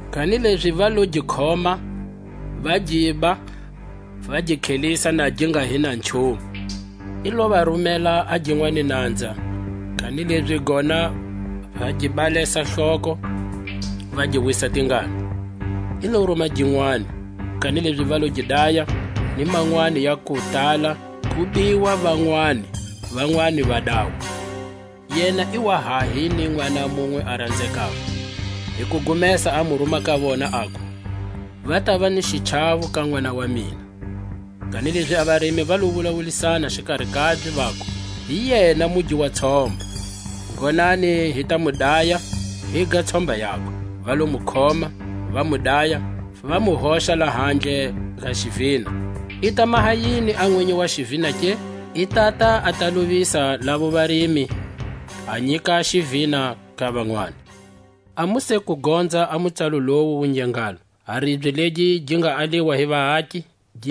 Kanilezi va lo gi khoma va giba, va gi tlhelisa na gi nga hi na nchumu. I lo va rumela a ginwani nanza; kanilezi gona va gi balesa hloko, va gi wisa tingana. I lo ruma ginwani, kanilezi va lo gi daya; nj manwani ya kutala; ku biwa vanwani, vanwani va dawa. Yena i wa ha hi ni nʼwana munwe a ranzekako; hi kugumesa a mu ruma ka vona, aku: Va tava ni xichawo ka nʼwana wa mina. Kanilezi a varimi va lo wulawulisana xikari kabye, vaku: Hi yena mugi wa tshomba, ngonani hi ta mu daya, higa tshomba yakwe. Va lo mu khoma, va mu daya, va mu hoxa lahandle ka xivina. I ta maha yini a nwinyi wa xivina ke? I tata a ta lovisa lavo varimi, a nyika xivina ka vanwani. A mu se ku gonza a mutsalo lowu wu nge ngalo: A ribye legi gi nga aliwa hi vaaki,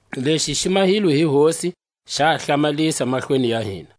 Lexi xi mahilwe hi Hosi, Xa hlamalisa mahlweni ya hina.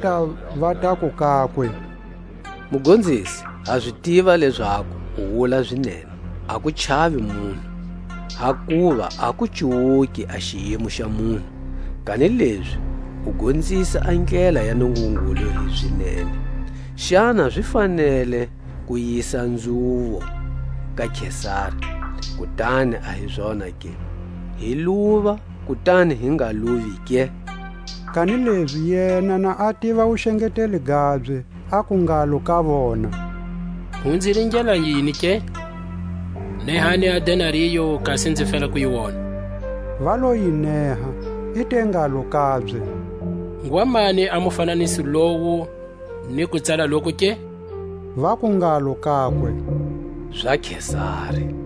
Va lota, va taku kakwe: Mugonzisi, ha zi tiva lezaku u wula zinene, a ku chavi munhu, hakuva a ku cuwuki a xiyimo xa vanhu, kanilezi u gonzisa a ndlela ya Nungungulu hi zinene. Xana zi fanele ku yisa nzhuvo ka Kesari, kutani a hi zona ke? Hi luva, kutani hi nga luvi ke? Kanilezi yena na a tiva a wuxengeteli gabye, aku ngalo ka vona: Mu nzi ringela yini ke? Nehani a denario, kasi nzi fela ku yi wona. Va yi neha. I te ngalo kabye: Ngwa mani a mufananiso lowu ni kutsala loku ke? Vaku ngalo kakwe: Za Kesari.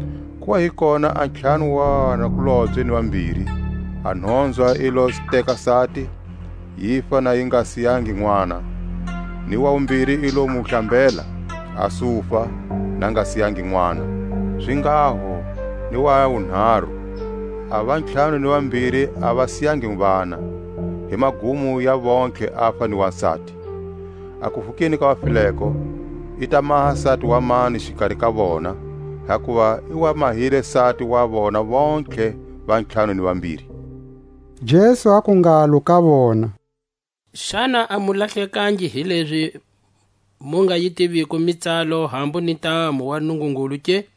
Ku wa hi kona a ntlhanu wa vanakulobye ni vambiri; a nhonzwa yi lo teka sati, yifa na yi nga siyangi nʼwana; ni wa wumbiri i lo mu hlambela, a sufa, na a nga siyangi nʼwana; zinghaho ni wa wunharu. A vantlhanu ni vambiri a va siyangi vana; hi magumo ya vontlhe afa ni wasati. A kuvukeni ka vafileko, i ta maha sati wa mani xikari ka vona, hakuva i wa mahile sati wa vona: vontlhe va ntlhanu ni Vambiri? Jesu aku ngalo ka vona: Xana a mu lahlekangi, hilezi mu nga yi tiviko mitsalo, hambu ni ntamu wa Nungungulu ke?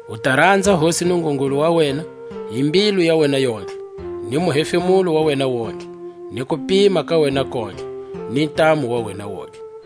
U ta ranza Hosi Nungungulu wa wena hi mbilu ya wena yontlhe, ni muhefemulo wa wena wontihe, ni kupima ka wena kontlhe, ni ntamu wa wena wontihe.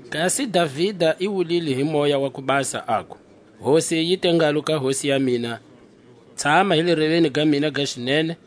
Kasi Davida i wulile hi Moya wa ku Basa, aku: Hosi yi te ngalo ka Hosi ya mina, Tshama hi le reveni ga mina ga xinene,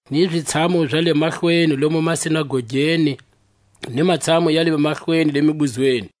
ni zitshamu za le mahlweni lomu masinagogeni, ni matshamu ya le mahlweni le mibuzweni;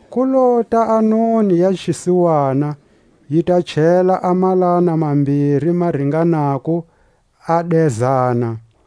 Ku lota a noni ya xisiwana, yi ta chela a malana mambiri ma ringanako ni dezana.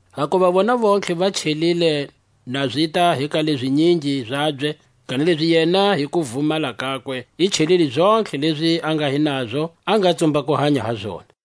hakuva vona vontlhe va chelile na zita hi ka leʼzinyingi zabye, kanilezi yena hi kuvumala kakwe i chelile zontlhe lezi a nga hi nazo a nga tsumba ku hanya hi zona.